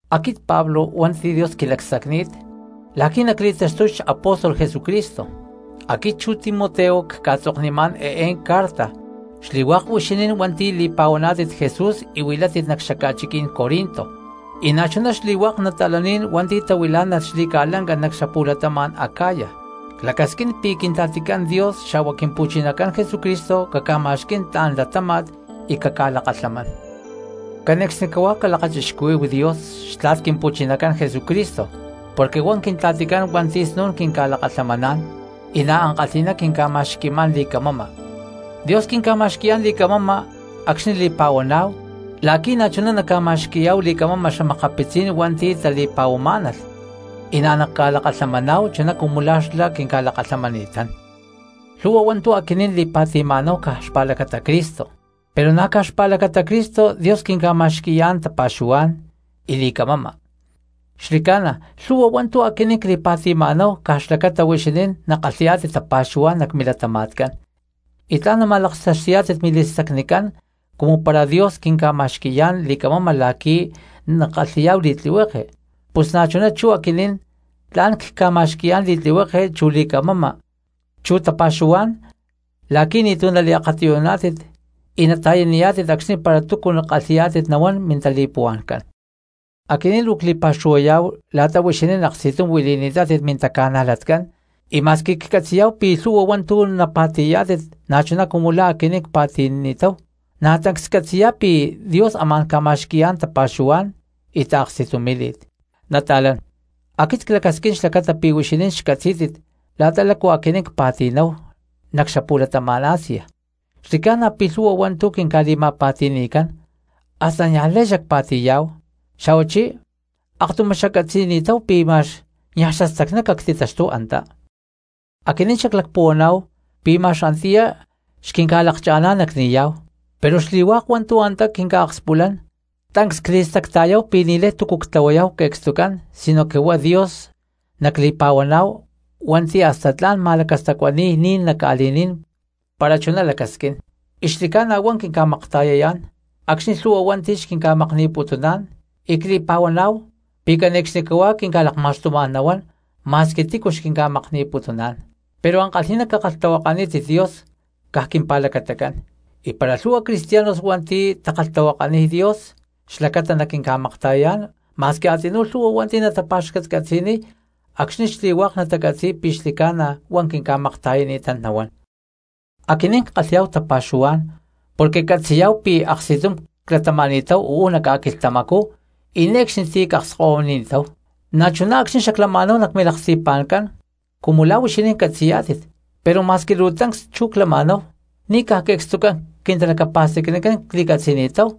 Aquit Pablo hua̠nti̠ Dios quilacsacni̠t la̠qui̠ nacli̠taxtuy xapóstol Jesucristo, aquit chu Timoteo cca̠tzoknimá̠n eé carta xli̠hua̠k huixinín hua̠nti̠ li̠pa̠huaná̠tit Jesús y huilátit nac xaca̠chiquí̠n Corinto y na̠chuná xli̠hua̠k nata̠laní̠n hua̠nti̠ tahuilá̠nalh xli̠ca̠lanca nac xapu̠latama̠n Acaya. Clacasquín pi̠ Quintla̠ticán Dios xa̠hua Quimpu̠chinacán Jesucristo caca̠ma̠xquí̠n tla̠n latáma̠t y caca̠lakalhamán. Cane̠cxnicahuá calakachixcuhuí̠hu Dios xtla̠t Quimpu̠chinacán Jesucristo porque huá Quintla̠ticán hua̠nti̠ snu̠n quinca̠lakalhamaná̠n y na̠ ankalhi̠ná quinca̠ma̠xqui̠má̠n li̠camama. Dios quinca̠ma̠xqui̠yá̠n li̠camama acxni̠ li̠puhuama̠náhu la̠qui̠ na̠chuná naca̠ma̠xqui̠yá̠hu li̠camama xa̠makapitzí̠n cristianos hua̠nti̠ tali̠puhuamá̠nalh, y na̠ naca̠lakalhamaná̠hu chuná cumu la̠ xlá quinca̠lakalhamani̠tán. Lhu̠hua hua̠ntu̠ aquinín li̠pa̠ti̠ma̠náhu caj xpa̠lacata Cristo, pero na̠ caj xpa̠lacata Cristo Dios quinca̠ma̠xqui̠yá̠n tapa̠xuhuá̠n y li̠camama. Xli̠ca̠na lhu̠hua hua̠ntu̠ aquinín cli̠pa̠ti̠ma̠náhu caj xlacata huixinín nakalhi̠yá̠tit tapa̠xuhuá̠n nac milatama̠tcán, y tla̠n nama̠laktaxti̠yá̠tit mili̠stacnicán; cumu para Dios quinca̠ma̠xqui̠yá̠n li̠camama la̠qui̠ nackalhi̠yá̠hu li̠tlihueke, pus na̠chuná chú aquinín tla̠n cca̠ma̠xqui̠yá̠n li̠tlihueke chu li̠camama chu tapa̠xuhuá̠n la̠qui̠ ni̠tu̠ naliakatiyuná̠tit y nata̠yaniyá̠tit acxni̠ para túcu kalhi̠yá̠tit nahuán mintali̠puhua̠ncán. Aquinín luu cli̠pa̠xuhuayá̠hu la̠ta huixinín aksti̠tum huili̠ni̠tátit mintaca̠najlatcán, y ma̠squi ccatzi̠yá̠hu pi̠ lhu̠hua hua̠ntu̠ napa̠ti̠yá̠tit na̠chuná cumu la̠ aquinín cpa̠ti̠ni̠táhu, na̠ tancs ccatzi̠yá̠hu pi̠ Dios amá̠n ca̠ma̠xqui̠yá̠n tapa̠xuhuá̠n y taaksti̠tumí̠li̠t. Nata̠lán, aquit clacasquín xlacata pi̠ huixinín xcatzí̠tit la̠ta lácu aquinín cpa̠ti̠náhu nac xapu̠latama̠n Asia. Xli̠ca̠na pi̠ lhu̠hua hua̠ntu̠ quinca̠li̠ma̠pa̠ti̠ni̠cán hasta niaj lay xacpa̠ti̠yá̠hu, xa̠huachí akatuyumá xaccatzi̠ni̠táhu pi̠ ma̠x niaj xastacná cactitaxtúhu antá. Aquinín xaclacpuhuaná̠hu pi̠ ma̠x antiyá xquinca̠lakcha̠ná̠n nacni̠yá̠hu, pero xli̠hua̠k hua̠ntu̠ antá quinca̠akspulán tancs cli̠stacta̠yáhu pi̠ ni̠lay túcu ctlahuayá̠hu que̠cstucán, sinoque huá Dios nacli̠pa̠huaná̠hu hua̠nti̠ hasta tla̠n ca̠ma̠lacastacuani̠y ní̠n nac ca̠li̠ní̠n para chuná lacasquín. Y xli̠ca̠na huá quinca̠makta̠yán acxni̠ lhu̠hua hua̠nti̠ xquinca̠makni̠putuná̠n, y cli̠pa̠huaná̠hu pi̠ cane̠cxnicahuá quinca̠lakma̠xtumá̠n nahuán ma̠squi tícu xquinca̠makni̠putuná̠n. Pero ankalhi̠ná cakalhtahuakanítit Dios caj quimpa̠lacatacán; y para lhu̠hua cristianos hua̠nti̠ takalhtahuakaniy Dios xlacata naquinca̠makta̠yayá̠n ma̠s a̠tzinú lhu̠hua hua̠nti̠ natapa̠xcatcatzi̠niy acxni̠ xli̠hua̠k natacatzi̠y pi̠ xli̠ca̠na huá quinca̠makta̠yani̠tán nahuán. Aquinín ckalhi̠yá̠hu tapa̠xuhuá̠n porque ccatzi̠yá̠hu pi̠ aksti̠tum clatama̠ni̠táhu uú nac ca̠quilhtamacú y ne̠cxni ti̠ cca̠akskahuini̠táhu, na̠chuná acxni̠ xaclama̠náhu nac milaksti̠pa̠ncán cumu la̠ huixinín catzi̠yá̠tit. Pero ma̠squi luu tancs chú clama̠náhu, ni̠ caj que̠cstucán quintalacapa̠stacnicán cli̠catzi̠ni̠táhu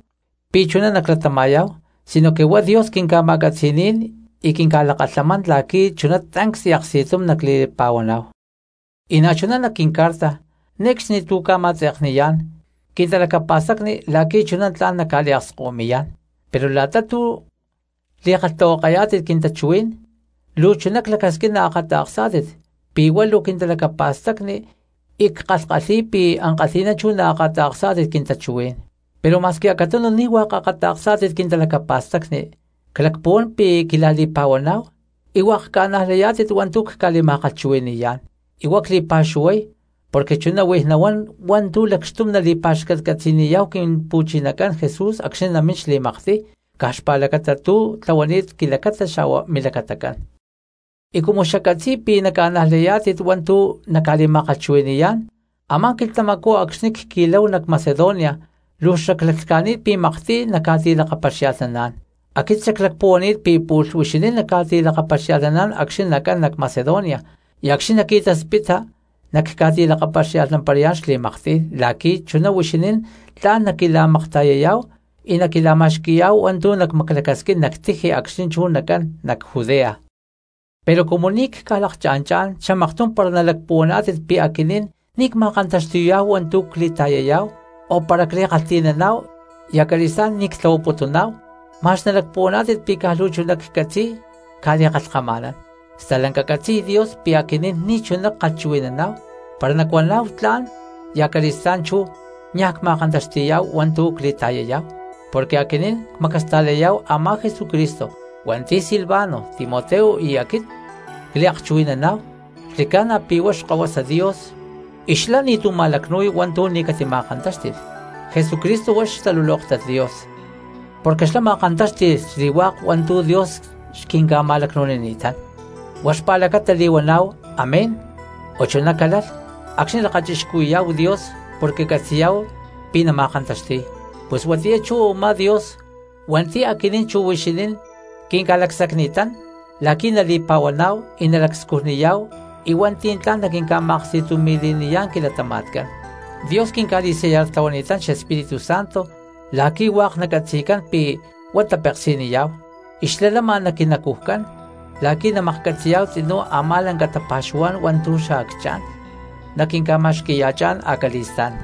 pi̠ chuná naclatama̠yá̠hu, sinoque huá Dios quinca̠ma̠catzi̠ní̠n y quinca̠lakalhamán la̠qui̠ chuná tancs y aksti̠tum nacli̠pa̠huaná̠hu. Y na̠chuná nac quincarta, ne̠cxni tu̠ cca̠ma̠tze̠kniyá̠n quintalacapa̠stacni la̠qui̠ chuná tla̠n nacca̠liakskahuimi̠yá̠n, pero la̠ta tu̠ li̠kalhtahuakayá̠tit quintachuhuí̠n luu chuná clacasquín naakata̠ksá̠tit pi̠ huá luu quintalacapa̠stacni, y ckalhkalhi̠y pi̠ ankalhi̠ná chuná naakata̠ksá̠tit quintachuhuí̠n. Pero ma̠squi acatunu ni̠ hua̠k akata̠ksá̠tit quintalacapa̠stacni clacpuhuán pi̠ quila̠li̠pa̠huaná̠hu y hua̠k ca̠najlayá̠tit hua̠ntu̠ cca̠li̠ma̠kalhchuhui̠ni̠yá̠n, y huá cli̠pa̠xuhuay porque chuná huij nahuán hua̠ntu̠ lacxtum nali̠pa̠xcatcatzi̠niyá̠hu Quimpu̠chinacán Jesús acxni̠ namín xli̠maktiy, caj xpa̠lacata tu̠ tlahuani̠t quilacata xa̠hua milacatacán. Y cumu xaccatzi̠y pi̠ naca̠najlayá̠tit hua̠ntu̠ nacca̠li̠ma̠kalhchuhui̠ni̠yá̠n, a̠má quilhtamacú acxni̠ cqui̠láhu nac Macedonia luu xaclaclhca̠ni̠t pi̠ maktiy nacca̠ti̠lakapaxia̠lhnaná̠n. Aquit xaclacpuhuani̠t pi̠ pu̠lh huixinín nacca̠ti̠lakapaxia̠lhnaná̠n acxni̠ nacán nac Macedonia y acxni̠ nacqui̠taspita nacca̠ti̠laktaxtuparayá̠n xli̠maktiy la̠qui̠ chuná huixinín tla̠n naquila̠makta̠yayá̠hu y naquila̠ma̠xqui̠yá̠hu hua̠ntu̠ nacmaclacasquín nac tiji acxni̠ chú nacán nac Judea. Pero cumu ni̠ cca̠lakanchá̠n xamaktum para nalacpuhuaná̠tit pi̠ aquit ni̠ cma̠kantaxti̠y hua̠ntu̠ cli̠ta̠yay, o para cli̠kalhti̠nán y acali̠stá̠n ni̠ ctlahuaputún, ma̠x nalacpuhuaná̠tit pi̠ caj luu chuná ccatzi̠y cca̠li̠kalhkama̠nán. Stalanca catzi̠y Dios pi̠ aquinín ni̠chuná ckalhchuhui̠naná̠hu para nacuaná̠hu “tla̠n” y acali̠stá̠n chú niaj cma̠kantaxti̠yá̠hu hua̠ntu̠ cli̠ta̠yayá̠hu. Porque aquinín cmacasta̠layá̠hu a̠má Jesucristo hua̠nti̠ Silvano, Timoteo y aquit cliakchuhui̠naná̠hu, xli̠ca̠na pi̠ huá Xkahuasa Dios y xlá ni̠tu̠ ma̠lacnu̠y hua̠ntu̠ ni̠ catima̠kantáxti̠lh. Jesucristo huá xtalulóktat Dios, porque xlá ma̠kantáxti̠lh xli̠hua̠k hua̠ntu̠ Dios xquinca̠ma̠lacnu̠nini̠tán. Huá xpa̠lacata li̠huaná̠hu “Amén” o “Chuná calalh” acxni̠ lakachixcuhui̠yá̠hu Dios, porque catzi̠yá̠hu pi̠ nama̠kantaxti̠y. Pus huatiyá chú u̠má Dios hua̠nti̠ aquinín chu huixinín quinca̠lacsacni̠tán la̠qui̠ nali̠pa̠huaná̠hu y nalacscujniyá̠hu y hua̠nti̠ tla̠n naquinca̠ma̠aksti̠tumi̠li̠niyá̠n quilatama̠tcán. Dios quinca̠li̠sellartlahuani̠tán xEspíritu Santo la̠qui̠ hua̠k nacatzi̠cán pi̠ huá tapeksi̠niyá̠hu y xlá lama nac quinacujcán la̠qui̠ namaklhcatzi̠yá̠hu tzinú a̠má lanca tapa̠xuhuá̠n hua̠ntu̠ xacchá̠n naquinca̠ma̠xqui̠ya̠chá̠n acali̠stá̠n.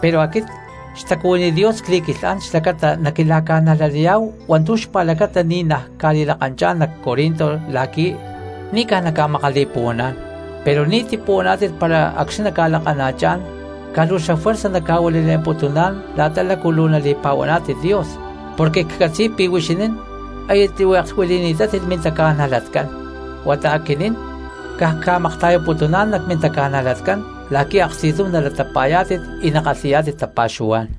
Pero aquit xtacuhuiní Dios cli̠quilhán xlacata naquila̠ca̠najlaniyá̠hu hua̠ntu̠ xpa̠lacata ni̠ naj cca̠li̠lakanchá̠n nac Corinto la̠qui̠ ni̠ caj nacca̠makali̠puhuaná̠n. Pero ni̠ tipuhuaná̠tit para acxni̠ nacca̠lakana̠chá̠n caj luu xafuerza nacca̠huanile̠mputuná̠n la̠ta lácu luu nali̠pa̠huaná̠tit Dios, porque ccatzi̠y pi̠ huixinín aya tlihueklh huili̠ni̠tátit mintaca̠najlatcán, huata aquinín caj cca̠makta̠yaputuná̠n nac mintaca̠najlatcán la̠qui̠ aksti̠tum nalatapa̠yá̠tit y nakalhi̠yá̠tit tapa̠xuhuá̠n.